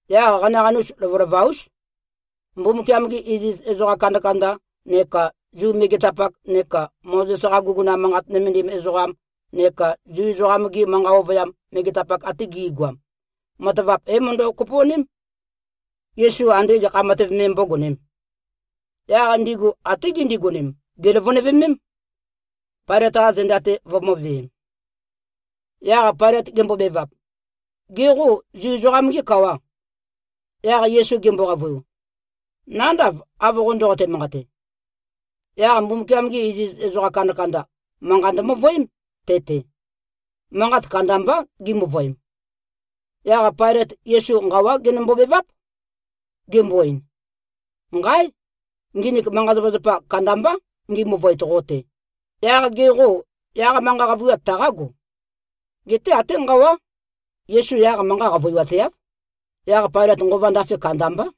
Yaq qanaqanus, lovølova-ús. Mbumbukiam-gi iziz ezoqa kandakanda neka Zu megetapak neka Mozes-qa guguna manqat nømendim ezoqam neka Zu ezoqam-gi manqa ovøyam megetapak ate gi꞉goam, matavap é-møndø-kopo꞉ném, Yesu ande gekha matev me mbógonēm. Yaq ndigu até gindigonem, gèløvønøvemém, Pailøt-qa zenda-te vømø̄veem. Yaq Pailøt gembobevap, “Gê, qo Zu ezoqam-gê kawà?” Yaq Yesu gembo-qavøiu, “Nándav, av qo ndoqote-manqate.” Yaq Mbumbukiam-gi iziz ezoqa kandakanda, manqa ndømøvøém te-te. Manqat kandambá gimøvøem. Yaq Pailøt Yesu nqawá genømbo-beváp, gembo-ein, “Nqáe! Nginik manqa-zapazapa kandambá ngi-møvøet qo-te. Yaq ge qô, yaq manqa qavøiwat taqágo?” Geté até nqawá, Yesu yaq manqa qavøiwateáv. Yaq Pailøt nqova ndafe kandambá.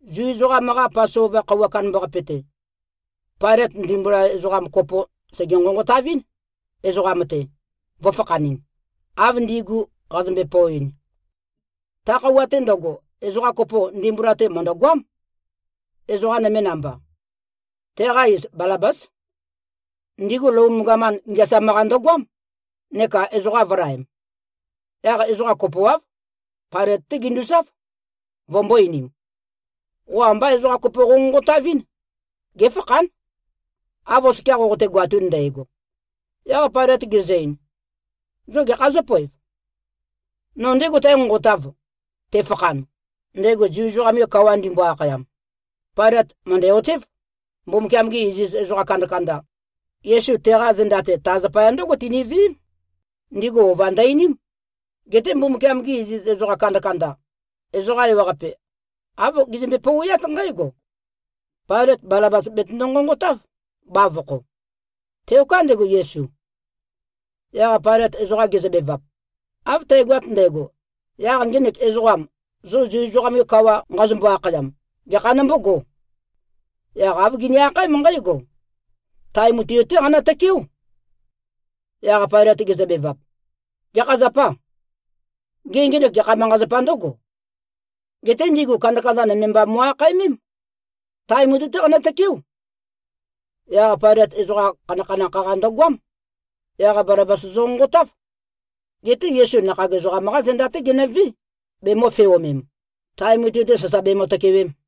Zu ezoqam-qa Pasova khøuwa kandambaqape-te, Pailøt, ndimbula ezoqa kopo sège-nqonqotavɨ́n, ezoqam-te, vø̄fakhanɨn, av ndigu qazømbe-poeɨn. Ta khøuwa-te ndøgo, ezoqa kopo ndimbula-te mø̀ndøgoám, ezoqa nøme namba. Teqa iz Balabás. Ndigu Lom gaman ngeasam-qa ndøgoám neka ezoqa vø̄laem. Yaq ezoqa kopoáv, Pailøt-té ginduzáv, vømbō-einim, “Qo ambá ezoqa kopo qonqonqotavɨ́n, géfakhán, av oskia qoqote-goatun ndægo.” Yaq Pailøt gezø-ein, “Zo gekhā zǿpoev? No ndégo tǽnqonqotāv, tefakhan, ndego Zu ezoqam-ge kawa ndimbo-akhayam?” Pailøt mø̀ndæ-otév, Mbumbukiam-gi iziz ezoqa kandakanda, Yesu teqa zenda-te, ta zapaya ndǿgo tiniveém. Ndigu ova ndø-einím. Geté Mbumbukiam-gi iziz ezoqa kandakanda, ezoqa ewaqape āv gizømbe-pouweát nqǽgo, “Pailøt Balabas betøndo-nqonqotáv, bavokho. Teoká ndego, Yesu.” Yaq Pailøt ezoqa gezøbevap, “Av tægoat ndægo, yaq ngenek ezoqam, zo Zu ezoqam-ge kawa nqazombo-akhayam, gekha nombógō?” Yaq āv gini-akhaém nqǽgo, “Tae mutui-té qanø-tøkeó!” Yaq Pailøt gezøbevap, “Gekha zapâ? Gê, ngenek gekha manqa-zapā ndǿgo?” Geté ndigu kandakanda nøme mba mo꞉-akhaemém, “Tae mutui-té qanø-tøkeó!” Yaq Pailøt ezoqa khanakhanakh-qa ndøgoám. Yaq Balabas zønqonqotáv. Geté Yesu nakhag ezoqam-qá zenda-té genøvé, bemø̄feomem, tae mutui-te sasa bemø-tøkewem.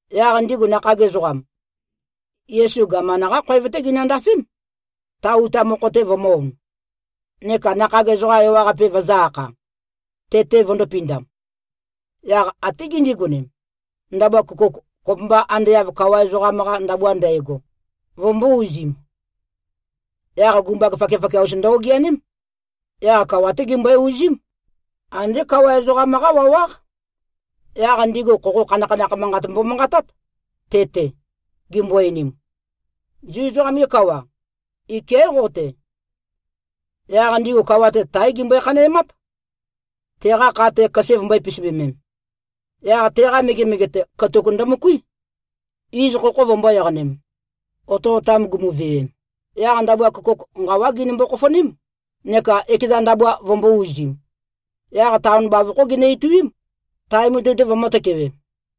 Yaq ndigu nakhag ezoqam, Yesu gaman-qá khoev-té ginøndafém, ta uta mokho-te vømø̄-on, neka nakhag ezoqa ewaqape vøzø̄-akha, te-te vøndō-pindam. Yaq até gindigonem, ndabua køkouk, kopømba ande av kawa ezoqam-qa ndabua ndægo, vømbō-uzim. Yaq gumbag fakiafakia-us ndø-ogeaném. Yaq kawa-té gimbøe-uzím. Andé kawa ezoqam-qá wawáq. Yaq ndigu khokho khanakhanakh manqat mbomanqatát te-te, gimbo-einim, “Zu ezoqam-ge kawa, iké꞉ qo-te.” Yaq ndigu kawa-te, táe gimbøe-khanæmát, teqa kha-te, køse vømbø̄e-pisibømem. Yaq teqa megemege-te, katuk ndømøkuí, iz khokho vømbō-eqanem. Otøotam gumuvewem, yaq ndabua køkouk, nqawá ginømbo-khofoném, neka ekeza ndabua vømbō-uzim. Yaq taon bavokhó ginø-ituím, tae mutui-te vømǿ-tøkewēm.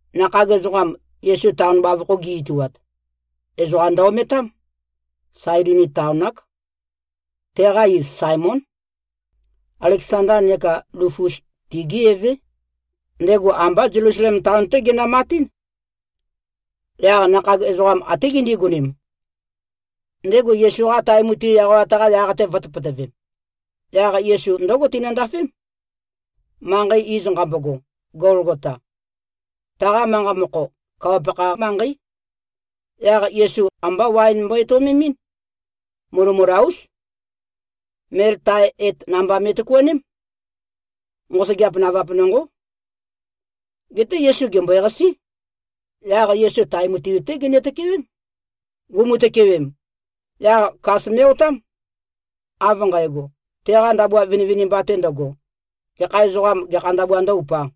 Nakhag ezoqam, Yesu taon bavokho gi꞉-ituat, ezoqa ndø-ometám. Sailini taon-ák. Teqa iz Saemón. Aleksanda neka Lufus, tigé evé. Ndego ambá Zelusalem taon-té genømatín. Yaq nakhag ezoqam até gindigonem, ndego Yesu-qa tae mutui eqawat-qa yaq-te vø̄tøpøtøvem. Yaq Yesu ndǿgo tinøndafém, manqei iz nqambogo, Golgota. Taqa manqa mokho, “Kawa-pakha manqeí.” Yaq Yesu ambá waen mbo-etøomemɨ́n. Mulømula-ús. Mel tae et namba me꞉tøkuaném. Nqosøgeap navap nonqó. Geté Yesu gèmbøeqasí. Yaq Yesu tae mutui-té ginø-tøkewém. Gumu-tøkewem, yaq kas me꞉-otám, av nqægo, teqa ndabua vinivinimba-te ndøgo, gekha ezoqām, gekha ndabua ndǿ-upā.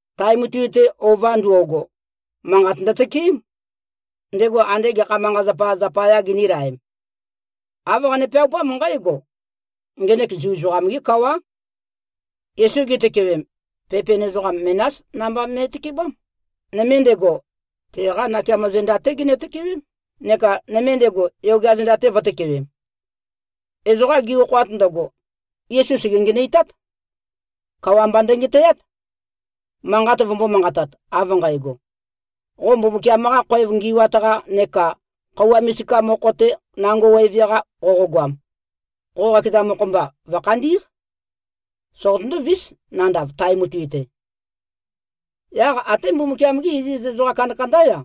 Tae mutui-te ova ndo꞉go, manqat ndøtøkeém, ndego andé gekha manqa-zapa zapayā ginīlaem. Āv qane-peaupám nqǽgo, “Ngenek Zu ezoqam-gé kawá.” Yesu gitøkewem, pepen ezoqam menás namba me꞉tøkebám. Nøme ndego, teqa nakeamo zenda-té ginø-tøkewém, neka nøme ndego, yogea zenda-te vø̄tøkewem. Ezoqa gi-okhoat ndøgo, Yesu sège-ngenøitát. Kawa mba ndøngetæát, manqat vømbō-manqatat, av nqægo, “Qo Mbumbukiam-qa khoev ngi꞉wat-qa neka khøuwa misika mokho-te nango weve-qa qoqogoam, qo qakeza mokho-mba vø̀khandí꞉q. Soqotøndó-vís, nandav tae mutui-te.” Yaq até Mbumbukiam-gí iziz ezoqa kandakandá-ya,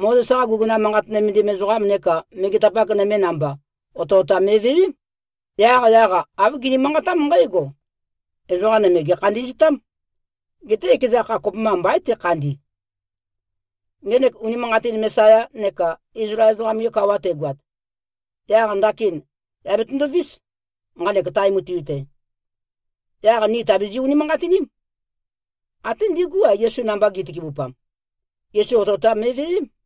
Mozes-qa guguna manqat nømendim ezoqam neka megetapak nøme namba, otøotam me꞉vewém. Yaqyaq-a, āv gini-manqatám nqǽgo, “Ezoqa nøme gèkhandi꞉ztám. Geté ekeza kha, kopømba mbaín tekhandi. Ngenek unimanqatin Mesaya neka Izlael ezoqam-ge kawa tegoat, yaq ndakin yà betøndovís, nqanek tae mutui-te. Yaq ni tàbizi-unimanqatiním.” Até ndígu-a, Yesu namba gi꞉tøkebupam, Yesu otøotam me꞉vewém.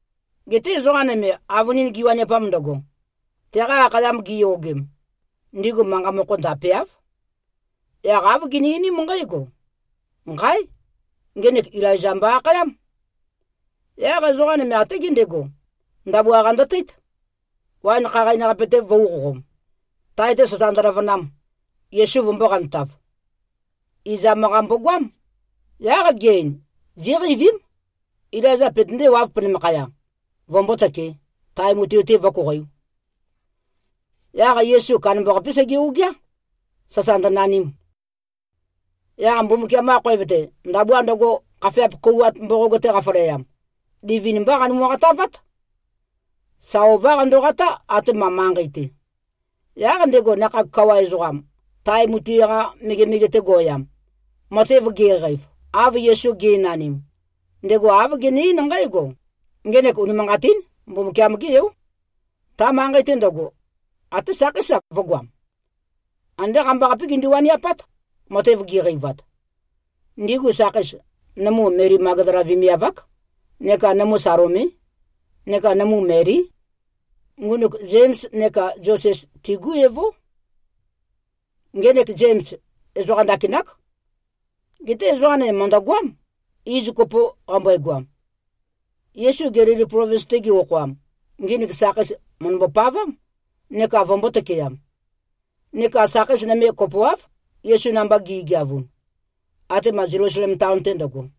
Geté ezoqa nøme, avønin giwaniapam ndøgo, teqa akhayam giyogem, ndigu manqa mokho ndapeáv. Yaq āv gini-einím nqǽgo, “Nqáe! Ngenek Ilaiza mbo-akhayám!” Yaq ezoqa nøme até gendego, ndabua-qa ndøteít, waen khaqain-qape-te vø̄uqoqom, tae-te sasa ndøløvønam, Yesu vømbō-qantav. Izam-qa mbogoám. Yaq ge-ein, “Zíqeivím, Ilaiza petøndéwāv penømakhaya, vømbótøkē, tae mutui-te vǿkoqoiū.” Yaq Yesu kandambaqapé sege-ogeá, sasa ndønanim. Yaq Mbumbukiam-qa khoev-te, ndabua ndøgo, khafeap kouwat mboqog-te qafaleam, livin-mbá qanømu-qatavát. Sa ová qandoqatá, atema manqei-te. Yaq ndego nakhag kawa ezoqam, tae mutui-qa megemege-te go꞉yam, matev ge꞉qeiv, av Yesu ge꞉nanim, ndego āv gene-eín nqǽgo, “Ngenek unimanqatín Mbumbukiam-gé Yó.” Ta manqei-te ndøgo, até sakheís-a, vø̄goam. Andé qambaqapé gindu-waniapát, matev giqeivat. Ndigu sakheis, nømu Meli Magdala vemiav-ák, neka nømu Salomé, neka nømu Melí. Ngunuk Zems neka Zoses, tigú evó. (Ngenek Zems ezoqa ndakinák. Geté ezoqa nøme mø̀ndøgoám, iz kopo qambøegoam.) Yesu Gelili plovins-te ge-okhoam, nginik sakheis mø̀ndømbo-pavám, neka vømbō-tøkeam. Neka sakheis nøme kopoáv, Yesu namba gi꞉geavun, atema Zelusalem taon-te ndøgo.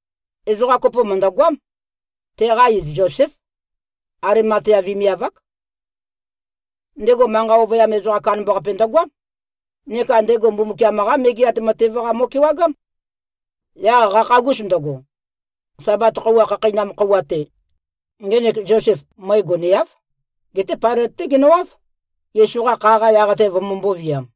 Ezoqa kopo mø̀ndøgoám. Teqa iz Zoséf. Alimatea vemiav-ák. Ndego manqa ovøyam ezoqam kandambaqape ndøgoám. Neka ndego Mbumbukiam-qá Megeat Matev-qa mo꞉kewagám. Yaq qakhagus ndøgo, Sabat khøuwa khakheinam khøuwa-te, ngenek Zosef, møe goneáv, geté Pailøt-té genøwáv, Yesu-qa kha-qa yaq-te vømømbō-viam.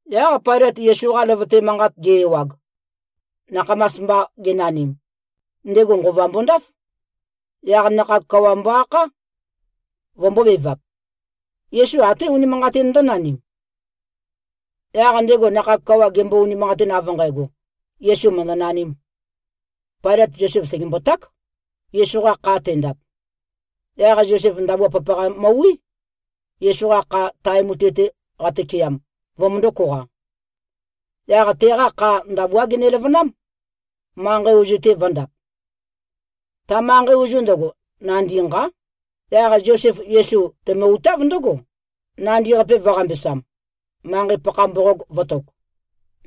Yaq Pailøt Yesu-qa løvøte manqat ge-ewag, nakhamas mba genanim, ndego nqova mbondáf. Yaq nakhag kawa mbo-akhá, vømbōbevap, “Yesu até unimanqatin ndǿnanim?” Yaq ndego nakhag kawa gembo-unimanqatin, av nqægo, Yesu mø̀ndønanīm, Pailøt Zosef sègemboták, Yesu-qa kha tendap. Yaq Zosef ndabua papaqa møwí, Yesu-qa kha, tae mutui-te qatøkeam, vømøndō-koqa. Yaq teqa kha ndabuá geneløvønám, manqei ozu-te vø̄ndap. Ta manqei ozu ndøgo, nandi nqá. Yaq Zosef Yesu temø-utáv ndǿgo, nandi-qape vø̄-qambesam, manqei-pakha mboqog vø̄tok.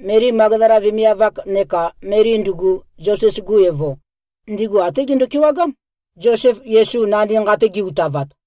Meli Magdala vemiav-ak, neka Meli ndugu, Zoses-gu evo, ndigu até gendo-kewagám, Zosef Yesu nandi nqa-te ge-utavat.